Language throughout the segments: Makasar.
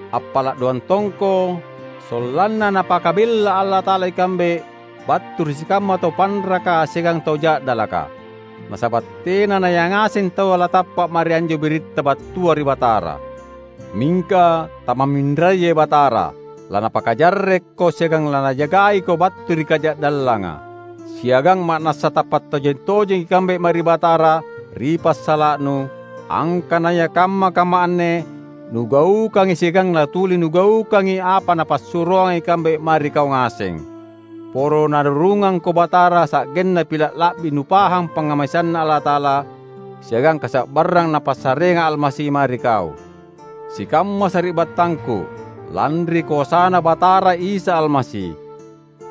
Appala’ doang tongko sollanna Napakabella Allata’ala ikambe battu ri sikamma tau panraka siagang tau ja’dalaka. Nasaba’ tena nayangaseng taua latappa’ mae ri anjo biritta battua ri Batara. Mingka tamamminrayai Batara. LaNapakajarrekko siagang laNajagaiko battu ri kaja’dallanga. Siagang ma’nassa tappa’ tojeng-tojengi ikambe mae ri Batara ri passala’nu, angkanaya kamma-kamma anne nugaukangi siagang latuli nugaukangi apa napassuroanga ikambe mae ri kau ngaseng. Poro Narurungangko Batara sa’genna pila’ la’bi nupahang pangngamaseanNa Allata’ala siagang kasa’barrang Napassareanga Almasi mae ri kau. Sikamma sari’battangku, lanri koasaNa Batara Isa Almasi,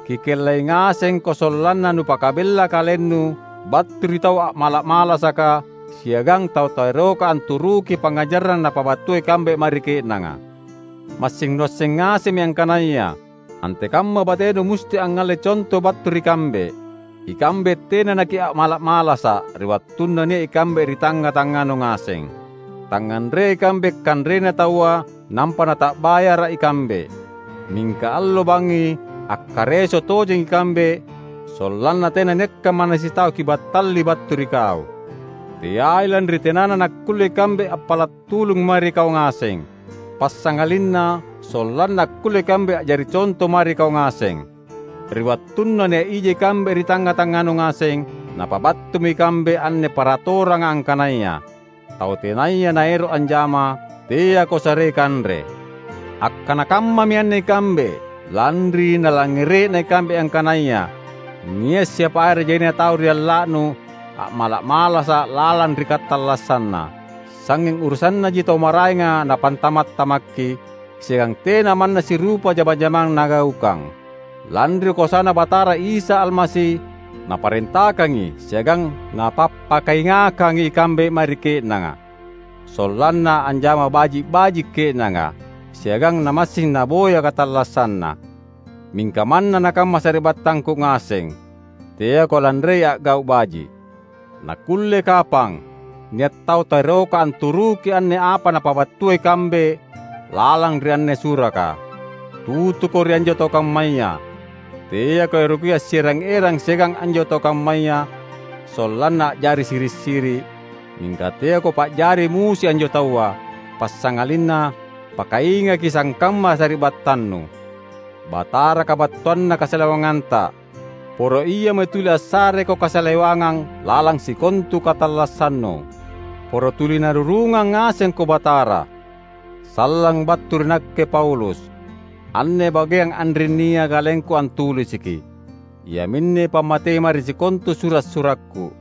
kikellai ngasengko sollanna nupakabella kalennu battu ri tau a’mala’-malasaka, siagang tau taeroka anturuki pangngajarang napabattua ikambe mae ri ke’nanga. Massing nuasseng ngasemmi angkanaya antekamma batenu musti angngalle conto battu ri kambe. Ikambe tena nakia’mala’-malasa’ ri wattunna nia’ ikambe ri tangnga-tangnganu ngaseng. Tangnganreai ikambe kanrena taua nampa nata’bayarra ikambe. Mingka allo bangngi akkareso tojeng ikambe sollanna tenanniakka manna sitau kibattali battu ri kau; teai lanri tenana nakkulle ikambe appala’ tulung mae ri kau ngaseng, passangalinna sollanna akkulle ikambe a’jari conto mae ri kau ngaseng. Ri wattunna nia’ ija ikambe ri tangnga-tangnganu ngaseng, napabattumi ikambe anne paratoranga angkanaya, "Tau tenaya naero’ anjama, teako sarei kanre." Akkana kammami anne ikambe lanri nalangngere’na ikambe angkanaya nia’ siapa are jaina tau ri alla’nu a’mala’-malasa’ lalang ri katallassanna. Sangnging urusannaji tau maraenga napantama’-tamakki, siagang tena manna sirupa jama-jamang nagaukang. Lanri koasaNa Batara Isa Almasi naparentakangi siagang napappakaingakkangi ikambe mae ri ke’nanga, sollanna anjama baji’-baji’ ke’nanga, siagang namassing naboya katallassanna. Mingka manna nakamma sari’battangku ngaseng, teako lanrei a’gau’ baji’. Nakulle kapang nia’ tau taeroka anturuki anne apa napabattua ikambe lalang ri anne suraka. Tutuko ri anjo tau kammaya; teako eroki assierang-erang siagang anjo tau kammaya sollanna a’jari siri’-siri’, mingka teako pa’jari musui anjo taua; passangalinna pakaingaki sangkamma sari’battannu. Batara kabattuanna kasalewanganta. Poro Iami tuli assareko kasalewangang lalang sikontu katallassannu. Poro tuli Narurungang ngasengko Batara. Sallang battu ri nakke Paulus. Anne bageang anrinnia kalengku antulisiki. Iaminne pammatei mae ri sikontu sura’-surakku.